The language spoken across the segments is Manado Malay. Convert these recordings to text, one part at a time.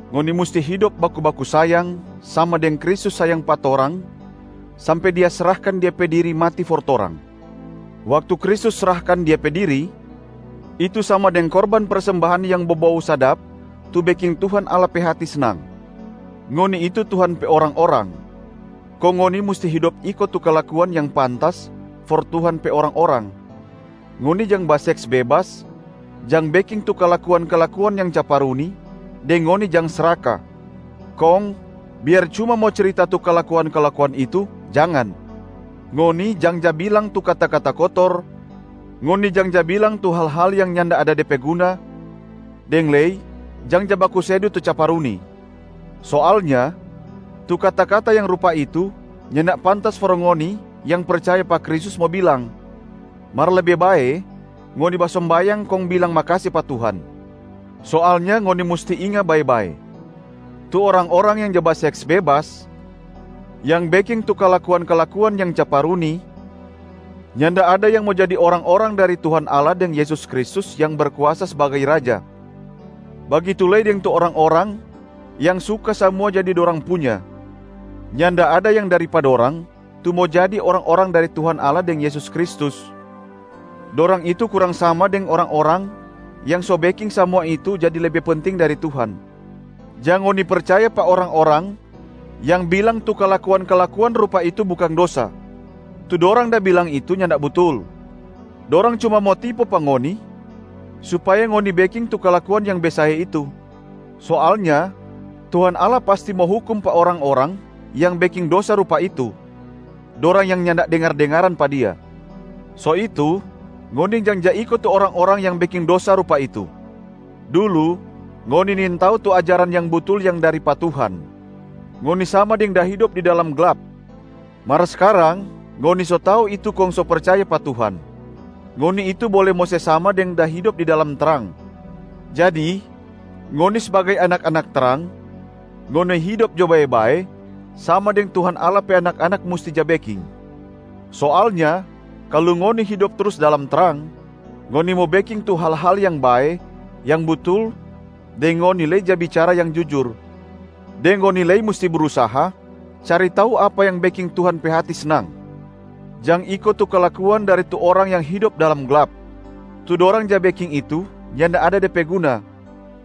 Ngoni musti hidop baku-baku sayang, sama deng Kristus sayang pa torang sampe Dia srahkan Dia pe diri mati for torang. Waktu Kristus srahkan Dia pe diri, itu sama deng korban persembahan yang bobou sadap tu beking Tuhan Allah pe hati snang. Ngoni itu Tuhan pe orang-orang, kong ngoni musti hidop iko tu kalakuan yang pantas for Tuhan pe orang-orang. Ngoni jang baseks bebas, jang beking tu kalakuan-kalakuan yang caparuni deng ngoni jang sraka, kong biar cuma mo cirita tu kalakuan-kalakuan itu jangan. Ngoni jang ja bilang tu kata-kata kotor, ngoni jang ja bilang tu hal-hal yang nyanda ada de pe guna, deng lei jang ja bakusedu tu caparuni. Soalnya tu kata-kata yang rupa itu nyanda pantas for ngoni yang percaya pa Kristus mo bilang, mar lebe bae ngoni basombayang kong bilang makase pa Tuhan. Soalnya ngoni musti inga bae-bae, tu orang-orang yang ja baseks bebas, yang beking tu kalakuan-kalakuan yang caparuni nyanda ada yang mo jadi orang-orang dari Tuhan Allah deng Yesus Kristus yang berkuasa sbagai Raja. Bagitu lei deng tu orang-orang yang suka samua jadi dorang punya, nyanda ada yang dari pa dorang tu mo jadi orang-orang dari Tuhan Allah deng Yesus Kristus, dorang itu kurang sama deng orang-orang yang so beking samua itu jadi lebe penting dari Tuhan. Jang ngoni percaya pa orang-orang yang bilang tu kalakuan-kalakuan rupa itu bukang dosa. Tu dorang da bilang itu nyanda butul. Dorang cuma mo tipu pa ngoni supaya ngoni beking tu kalakuan yang besae itu. Soalnya Tuhan Allah pasti mo hukum pa orang-orang yang beking dosa rupa itu, dorang yang nyanda dengar-dengaran pa Dia. So itu ngoni jang ja iko tu orang-orang yang beking dosa rupa itu. Dulu, ngoni nintau tu ajaran yang butul yang dari pa Tuhan, ngoni sama deng da hidop di dalam glap. Mar skarang ngoni so tau itu kong so percaya pa Tuhan, ngoni itu bole mo sama deng da hidop di dalam trang. Jadi ngoni sbagai anak-anak trang, ngoni hidop jo bae-bae sama deng Tuhan Allah pe anak-anak musti ja beking. Soalnya kalu ngoni hidop trus dalam trang, ngoni mo beking tu hal-hal yang bae, yang butul deng ngoni lei ja bicara yang jujur. Deng ngoni lei musti brusaha cari tau apa yang beking Tuhan pe hati snang. Jang iko tu kalakuan dari tu orang yang hidop dalam glap, tu dorang ja beking itu nyanda ada de pe guna,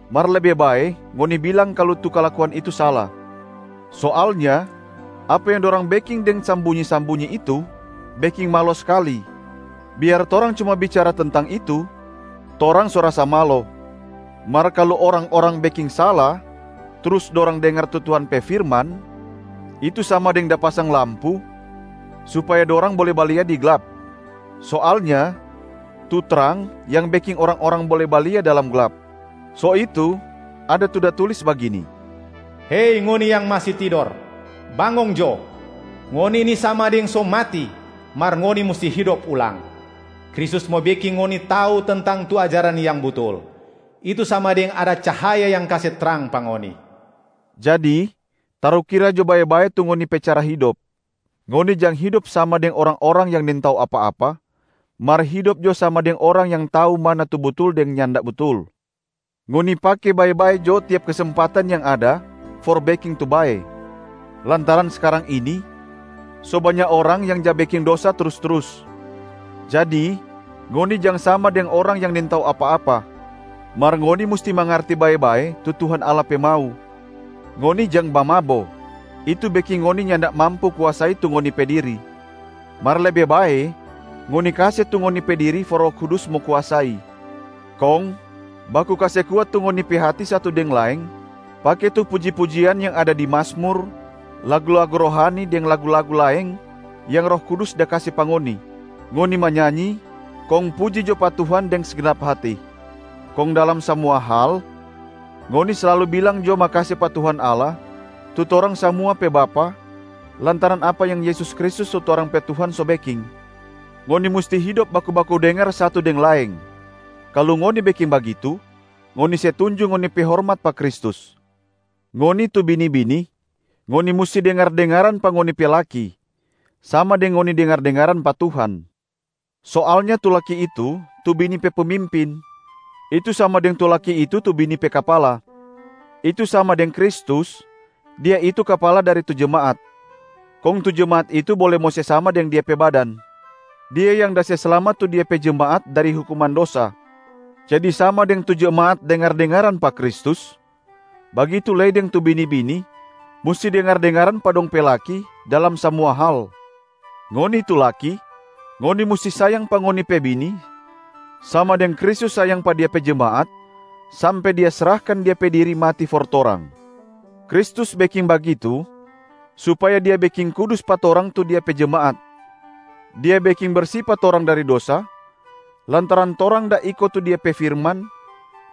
mar lebe bae ngoni bilang kalu tu kalakuan itu sala. Soalnya apa yang dorang beking deng sambunyi-sambunyi itu beking malo skali, biar torang cuma bicara tentang itu torang so rasa malo. Mar kalu orang-orang beking sala, trus dorang dengar tu Tuhan pe firman, itu sama deng da pasang lampu supaya dorang bole balia di glap. Soalnya tu trang yang beking orang-orang bole balia dalam glap. So itu, ada tu da tulis bagini, “Hei ngoni yang masi tidor, bangong jo, ngoni ini sama deng so mati mar ngoni musti hidop ulang. Kristus mo beking ngoni tau tentang tu ajaran yang butul, itu sama deng ada cahaya yang kase trang pa ngoni.” Jadi tarukira jo bae-bae tu ngoni pe cara hidop. Ngoni jang hidop sama deng orang-orang yang nintau apa-apa, mar hidop jo sama deng orang yang tau mana tu butul deng nyanda butul. Ngoni pake bae-bae jo tiap kesempatan yang ada for beking tu bae, lantaran skarang ini so banya orang yang ja beking dosa trus-trus. Jadi ngoni jang sama deng orang yang nintau apa-apa, mar ngoni musti mangarti bae-bae tu Tuhan Allah pe mau. Ngoni jang bamabo, itu beking ngoni nyanda mampu kuasai tu ngoni pe diri, mar lebe bae ngoni kase tu ngoni pe diri for Roh Kudus mo kuasai. Kong baku kase kuat tu ngoni pe hati satu deng laeng pake tu puji-pujian yang ada di Mazmur, lagu-lagu rohani deng lagu-lagu laeng yang Roh Kudus da kase pa ngoni. Ngoni manyanyi kong puji jo pa Tuhan deng segnap hati. Kong dalam samua hal, ngoni slalu bilang jo makase pa Tuhan Allah tu torang samua pe Bapa lantaran apa yang Yesus Kristus tu torang pe Tuhan so beking. Ngoni musti hidop baku-baku dengar satu deng laeng, kalu ngoni beking bagitu ngoni se tunjung ngoni pe hormat pa Kristus. Ngoni tu bini-bini, ngoni musti dengar-dengaran pa ngoni pe laki, sama deng ngoni dengar-dengaran pa Tuhan. Soalnya tu laki itu tu bini pe pemimpin, itu sama deng tu laki itu tu bini pe kapala. Itu sama deng Kristus, Dia itu kapala dari tu jemaat, kong tu jemaat itu bole mo se sama deng Dia pe badan. Dia yang da se slamat tu Dia pe jemaat dari hukuman dosa. Jadi sama deng tu jemaat dengar-dengaran pa Kristus, bagitu lei deng tu bini-bini musti dengar-dengaran pa dong pe laki dalam samua hal. Ngoni tu laki, ngoni musti sayang pa ngoni pe bini sama deng Kristus sayang pa Dia pe jemaat, sampe Dia srahkan Dia pe diri mati for torang. Kristus beking bagitu supaya Dia beking kudus pa torang tu Dia pe jemaat, Dia beking bersi pa torang dari dosa lantaran torang da iko tu Dia pe firman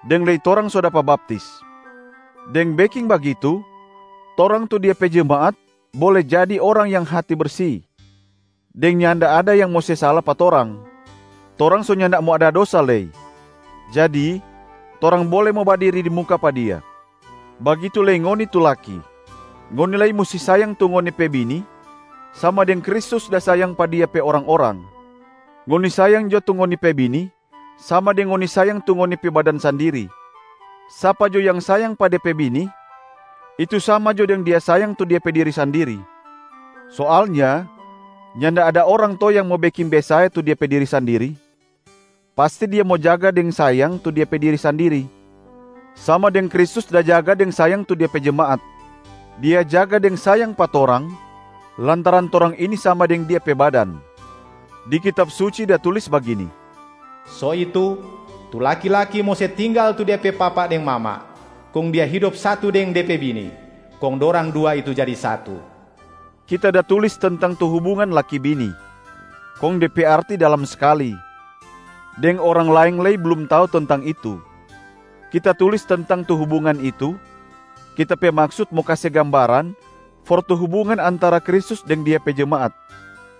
deng lei torang so dapa baptis. Deng beking bagitu, torang tu Dia pe jemaat bole jadi orang yang hati bersi, deng nyanda ada yang mo se sala pa torang, torang so nyanda mo ada dosa lei, jadi torang bole mo badiri di muka pa Dia. Bagitu lei ngoni tu laki, ngoni lei musti sayang tu ngoni pe bini sama deng Kristus da sayang pa Dia pe orang-orang. Ngoni sayang jo tu ngoni pe bini sama deng ngoni sayang tu ngoni pe badan sandiri. Sapa jo yang sayang pa de pe bini, itu sama jo deng dia sayang tu dia pe diri sandiri. Soalnya nyanda ada orang to yang mo beking besae tu de pe diri sandiri, pasti dia mo jaga deng sayang tu dia pe diri sandiri, sama deng Kristus da jaga deng sayang tu De pe jemaat. Dia jaga deng sayang pa torang lantaran torang ini sama deng Dia pe badan. Di Kitab Suci da tulis bagini, “So itu tu laki-laki mo se tinggal tu de pe papa deng mama, kong dia hidop satu deng de pe bini, kong dorang dua itu jadi satu.” Kita da tulis tentang tu hubungan laki bini, kong de pe arti dalam skali deng orang laeng lei blum tau tentang itu. Kita tulis tentang tu hubungan itu, kita pe maksut mo kase gambaran for tu hubungan antara Kristus deng Dia pe jemaat.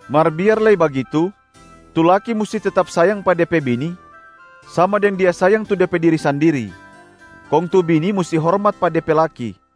Mar biar lei bagitu, tu laki musti tetap sayang pa de pe bini sama deng dia sayang tu de pe diri sandiri, kong tu bini musti hormat pa de pe laki.